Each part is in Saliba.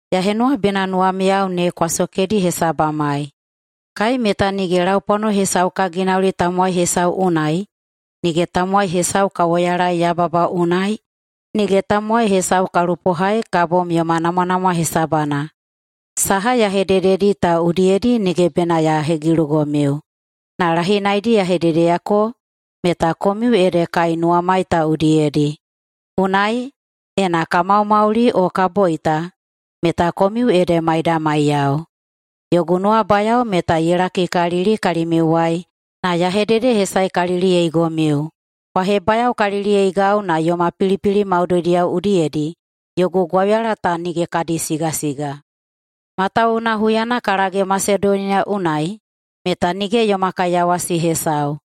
Ya henuwa bena nuwamiyao ne kwa sokedi hesabamai. Kai meta nige laupwano hesau ka ginauli tamowai hesau unai, nige tamowai hesau ka woyalaei yababa unai, nige tamowai hesau ka lupohai ka bom yoma namwanamwa hesabana. Saha ya hedededi ta udiyedi nige bena ya hegilugomiu, na lahinaidi ya hededeyako meta komiu ede kai nuwamai ta udiyedi. Unai, ena ka maumauli o ka boita meta komiu ede maidamaiyao. Yogu nuwabayao meta ye lakikalili kalimiuwai na ya hededehesaekaliliyeigomiu. Kwa hebayaokaliliyeigau na yoma pilipili maudoidiyao udiyedi yogu gwauyala ta nige kadi sigasiga. Matawuwuna huyana ka lage Masedoniya unai meta nige yoma kaiyawasi hesau.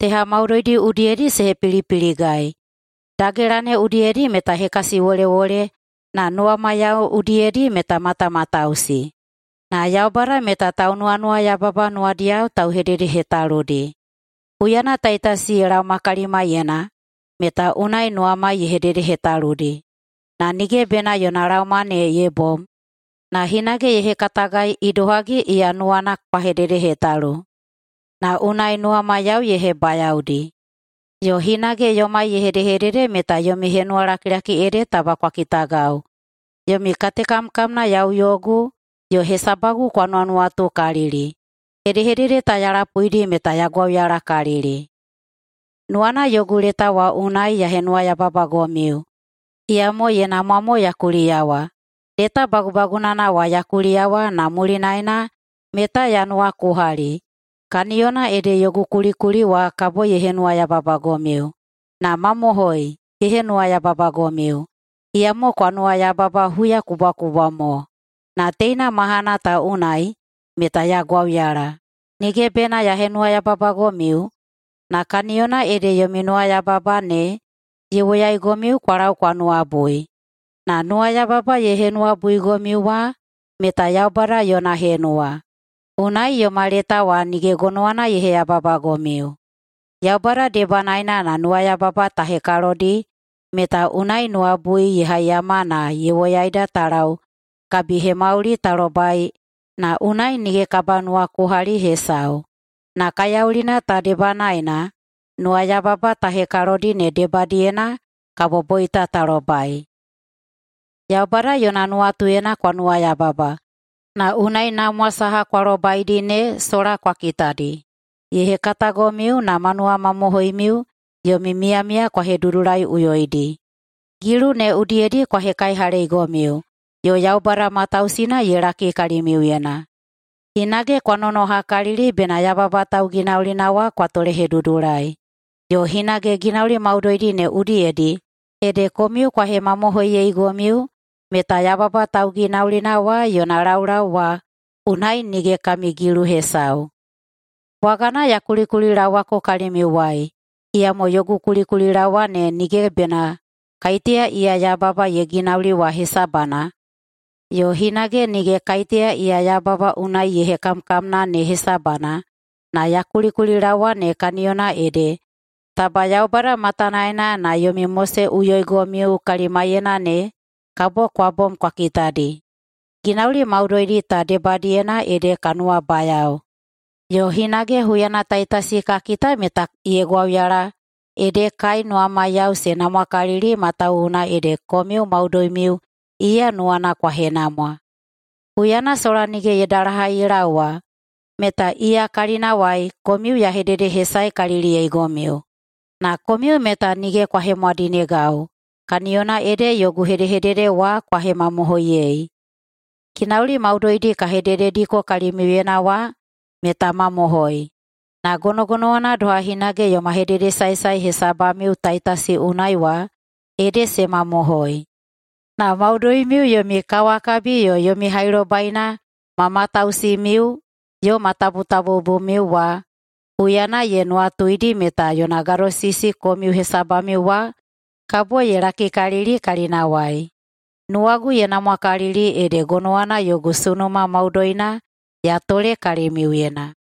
Teha maudoidi udiyedi se hepilipiligai. Dagela ne udiyedi meta hekasiwolewole, na nuwamaiyao udiyedi meta matamatausi. Na Yaubada meta taunuwanuwayababa nuwadiyao tauhededehetaludi. Huyana Taitasi ye laoma kalimaiyena meta unai nuwamai ye hededehetaludi. Na nige bena yona laoma ne ye bom, na hinage ye hekatagai idohagi iya nuwana kwa hededehetalu, na unai nuwamaiyao ye hebayaodi. Yo hinage yomai ye hedehedede meta yomi henuwalakilaki ede taba kwa kitagau, yomi katekamkamna yau yogu, yo hesabagu kwa nuwanuwatukalili. Hedehedede ta ya lapuidi meta ya gwauyalakalili. Nuwana yogu leta wa unai ya henuwayababagomiu, iyamo ye namwa mo ya kuliyawa. Leta bagubagunana wa ya kuliyawa na mulinaena meta ya nuwakuhali, kaniyona ede yogu kulikuli wa kabo ye henuwayababagomiu. Na mamohoi ye henuwayababagomiu, iyamo kwa nuwayababa huyakubwakubwa mo. Na teina mahana ta unai meta ya gwauyala, nige bena ya henuwayababagomiu, na kaniyona ede yomi nuwayababa ne ye woyaigomiu kwa lau kwa nuwabui. Na nuwayababa ye henuwabuigomiu wa meta Yaubada yona henuwa, unai yoma leta wa nige gonowana ye heyababagomiu. Yaubada debanaena na nuwayababa ta hekalodi meta unai nuwabui ye haiyama na ye woyaida ta lau kabihemauli ta lobai na unai nige kabanuwakuhali hesau. Na kaiyaulina ta debanaena nuwayababa ta hekalodi ne debadiyena kabo boita ta lobai. Yaubada yona nuwatuyena kwa nuwayababa, na unai namwa saha kwa lobaidi ne sola kwa kitadi. Ye hekatagomiu na ma nuwamamohoimiu yomi miyamiya kwa hedudulaiꞌuyoidi. Gilu ne udiyedi kwa hekaihaleigomiu, yo Yaubada matausina ye laki kalimiuyena. Hinage kwa nonohakalili bena yababa tauginaulina wa kwa tolehedudulai. Yo hinage ginauli maudoidi ne udiyedi ede komiu kwa hemamohoiyeigomiu meta yababa tauginaulina wa yona laulau wa unai nige kami gilu hesau. Bwagana ya kulikulilaowako kalimiuwai, iyamo yogu kulikulilaowa ne nige bena kaiteya iya yababa ye ginauli wa hesabana yo hinage nige kaiteya iya yababa unai ye hekamkamna ne hesabana, na ya kulikulilaowa ne kaniyona ede taba Yaubada matanaena na yomi moseꞌuyoigomiu kalimaiyena ne kabo kwa bom kwa kitadi. Ginauli maudoidi ta debadiyena ede ka nuwabayao. Yo hinage huyana Taitasi ka kita meta ye gwauyala ede kai nuwamaiyao se namwakalili matawuwuna ede komiu maudoimiu iya nuwana kwa henamwa. Huyana sola nige ye dalahai ye laowa meta iya kalinawai komiu ya hededehesaekaliliyeigomiu, na komiu meta nige kwa hemwadinegau [kaniyona ede yogu hedehedede wa kwa hemamohoiyei.] Ginauli maudoidi ka hededediko kalimiuyena wa meta mamohoi, na gonogonowana doha hinage yoma hededesaesae hesabamiu Taitasi unai wa ede se mamohoi. Na maudoimiu yomi kawakabi yo yomi hailobaina ma matausimiu yo ma tabutabubumiu wa huyana ye nuwatuidi meta yona gadosisi komiu hesabamiu wa kabo ye lakikalili kalinawai. Nuwagu ye namwakalili ede gonowana yogu sunuma maudoina ya tole kalimiuyena.